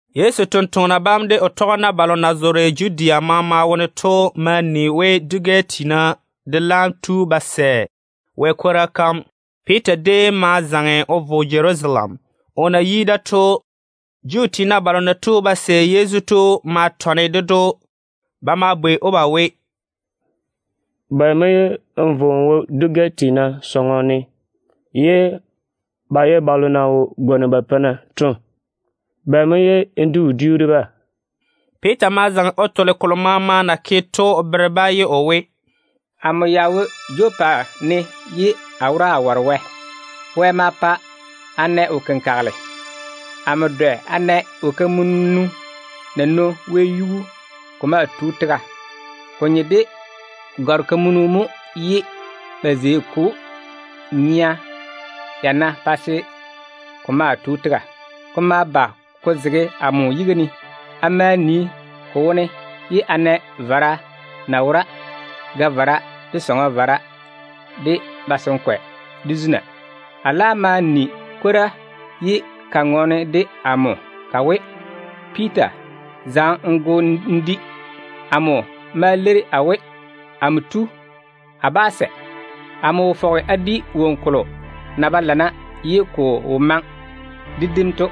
Yezu totoŋa nakwa bam de o tɔgena balo na zoore Judea teene dem maama wone to ma ni we dwi-gɛ tiina de laam tu ba sɛ Wɛ kwora kam. Piita déem ma zaŋe o vo Jerusalem. O na yi da to, Juu tiina balo na tu ba sɛ Yezu to ma bwɛ‑o. Ba ma bwei‑o ba we, “Bɛ mo ye n vo n wo dwi-gɛ tiina sɔŋɔ ne ye ba ye balo na wo gwoni ba peina to? Bɛ mo ye n di wodiu de-ba?” Piita ma zaŋe o tole kolo maama na ke to o bere-ba ye o we: “Amo ya wo Jopa ne ye a wora a ware Wɛ. Wɛ ma pa a na wo-kenkagele. Amo dwɛ a na wo-kamunu na nwoŋi wɛyuu ko maa tu tega. Ko nye de gɔr-kamunu mo ye ba zei ko nyea yana pa se ko maa tu tega. Ko ma ba ko zege amo yiga ne. A ma nii ko wone ye a na vara na wora, ga-vara, de sɔŋɔ vara, de tega-veila, de zuna. A laam ma ni kwora ye ka ŋɔɔne de amo ka we, ‘Piita, zaŋe n go n di.’ Amo ma leiri a we, ‘Amo tu, a bá sɛ. Amo wo fɔge a di woŋo kolo na ba lana ye ko wo maŋe de dim to.’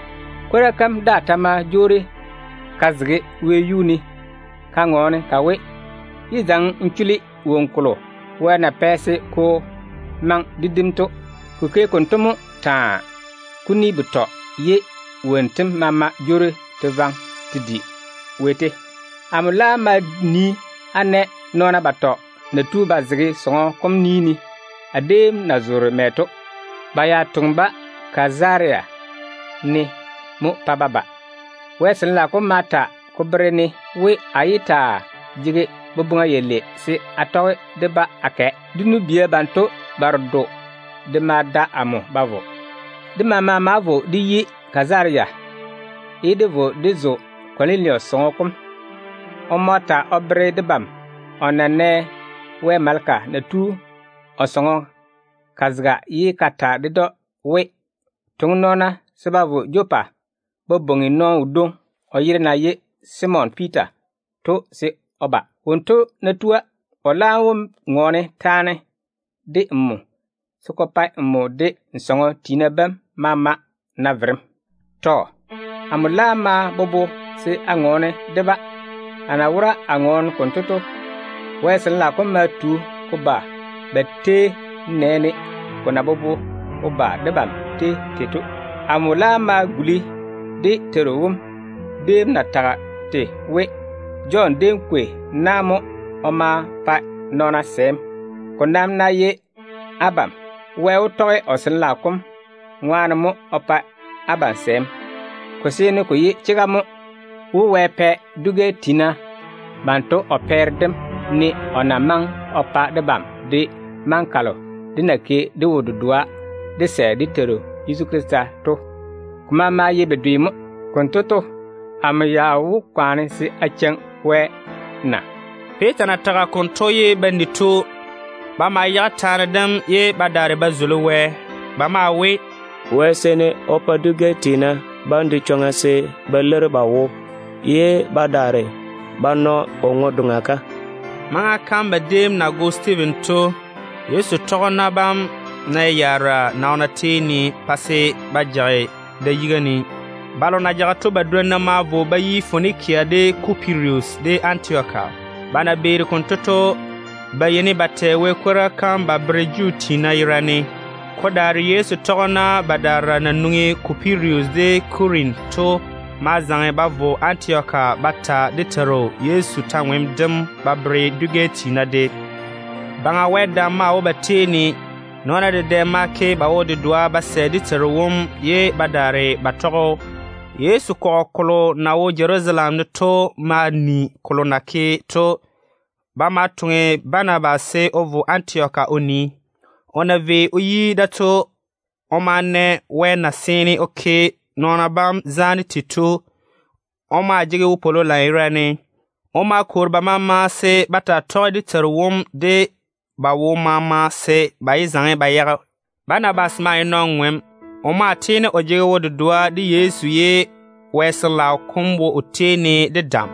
Kwora kam daa ta ma jwoori ka zege wɛyuu ne ka ŋɔɔne ka we, ‘Yé zaŋe n chuli woŋo kolo Wɛ na pɛ se ko maŋe de dim to.’ Ko ke konto mo taa, kuni betɔ, ye wonnu tem maama jwoori te vaŋe te di wɛyuu. Amo laam ma nii a na nɔɔna batɔ ba tu ba zege sɔŋɔ kolo a na zoore to ni ne. Ba ya toŋe-ba Kazaria ne mo pa ba ba. Wɛ Sin-laao kom ma ta ko bere-ne we, a yé taa jege boboŋa yalei se a tɔge de-ba a kɛ. Dé nu-bia banto baredo de ma da amo ba vo. Dé maama ma vo dé yi Kazaria, ye dé vo dé zo Kɔnilusi sɔŋɔ kom. O ma ta o bere debam we o nɛ Wɛ maleka na tu o sɔŋɔ ka zega ye ka ta ded‑o we, ‘Toŋe nɔɔna se ba vo Jopa ba bwoŋi nɔɔno wodwoŋi o yere na ye Simon Piita to se o ba. Wonto ná tua, o laam wó ŋɔɔne taane de nmo se ko pa nmo de n sɔŋɔ tiina bam maama na verem.’ Tɔ. Amo laam ma bobo se a ŋɔɔne de-ba. A na wora a ŋɔɔne konto to, Wɛ Sin-laao kom ma tu ko ba ba tei, nenɛɛne ko na bobo ko ba debam tei tei to. Amo laam ma guli dé Teiru wom déem na tage tei we, ‘Jɔn déem kwei na mo o ma pa nɔɔna sɛɛm. Ko nam ná ye abam, Wɛ wó tɔge o Sin-laao kom ŋwaane mo o pa abam sɛɛm.’ Ko seene ko ye chega mo we, Wɛ pɛ dwi-gɛ tiina banto o pɛɛre dem ne o na maŋe o pa debam de maŋa kalo dé na ke dé wo-dedoa dé sɛ dé Teiru Yezu Krista to. Ko maama ye bedwe mo. Konto to, amo ya wó kwaane se a cheiŋi Wɛ na?” Piita na tage konto ye ba ni to, ba ma yage taane dem ye ba daare ba tei Wɛ. Ba maa we, “Wɛ seene o pa dwi-gɛ tiina bam de chwoŋa se ba leiri ba wo ye ba daare ba na o ŋwe-doŋa kam.” Maŋa kam ba déem na go Stiiven to, Yezu tɔgena bam nɛ yaara nɔɔna tei ne pa se ba jage da yiga ne. Balo na jage to badwonna ma vo ba yi Fonikia, de Kupirus, de Antioka. Ba na beeri konto to, ba yeini ba tɛ Wɛ kwora kam ba bere Juu tiina yerane. Ko daare Yezu tɔgena badaara na nwoŋi Kupirus de Kurene to ma zaŋe ba vo Antioka ba ta dé Teiru Yezu kwor-ywoŋa kam ba bere dwi-gɛ tiina de. Baŋa Wɛ dam maa wo ba tei ne. Nɔɔna dedɛ ma ke ba wo-dedoa ba sɛ dé Teiru wom ye ba daare ba tɔge‑o. Yezu kɔgɔ kolo na wo Jerusalem ne to ma ni kolo na ke to. Ba ma toŋe Banabas se o vo Antioka o nii. O na vei o yi da to, o ma na Wɛ na seene o ke nɔɔna bam zaane tei to. O maa jege wopwolo lanyerane. O ma kwoori ba maama se ba taa tɔge dé Teiru wom de ba wo maama se ba yé zaŋe ba yage. Banabas maa ye nɔn-ŋom. O maa tiini o jege wo-dedoa de Yezu, ye Wɛ Sin-laao kom wo o tei ne de dam.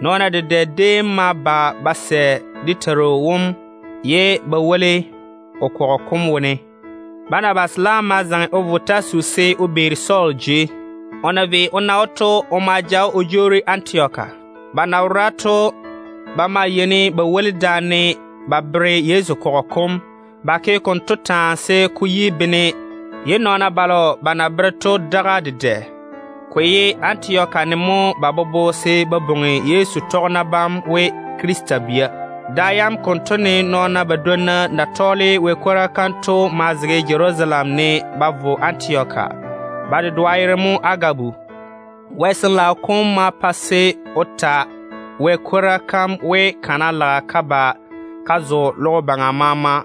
Nɔɔna dedɛ déem ma ba ba sɛ dé Teiru wom ye ba woli o kɔgɔ kom wone. Banabas laam ma zaŋe o vo Tasusi se o beeri Sɔɔl jei. O na vei o na‑o to, o ma ja‑o o jwoori Antioka. Ba na wora to, ba maa yeini ba woli daane ba bere Yezu kɔgɔ kom. Ba ke konto taa se ko yi bene, ye nɔɔna balo ba na bere to daga dedɛ. Ko ye Antioka ne mo ba bobo se ba bwoŋi Yezu tɔgena bam we Krista bia. Da yam konto ne Wɛ ni-jwoŋina badwonna na tɔɔle o kwora to ma zege Jerusalem ne ba vo Antioka. Ba dedoa yere mo Agabu. Wɛ Sin-laao kom ma pa se o ta Wɛ kwora kam we, kana lage ka ba ka zo logo baŋa maama.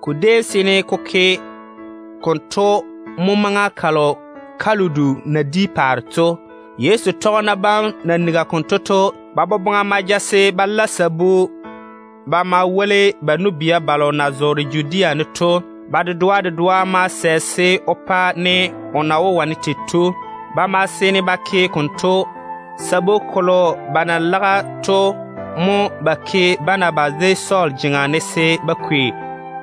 Ko déem seene ko ke konto mo maŋa kalo Kaludu na di paare to. Yezu tɔgena bam na nigi konto to, ba boboŋa ma ja se ba la sabu ba ma woli ba nu-bia balo na zoore Judea ne to. Ba dedoa dedoa ma sɛ se o pa ne o na wó wane tei to. Ba ma seene ba ke konto. Sabu kolo ba na lage to mo ba ke Banabas de Sɔɔl jeŋa ne se ba kwei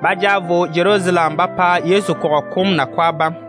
ba ja vo Jerusalem ba pa Yezu kɔgɔ kom nakwa bam.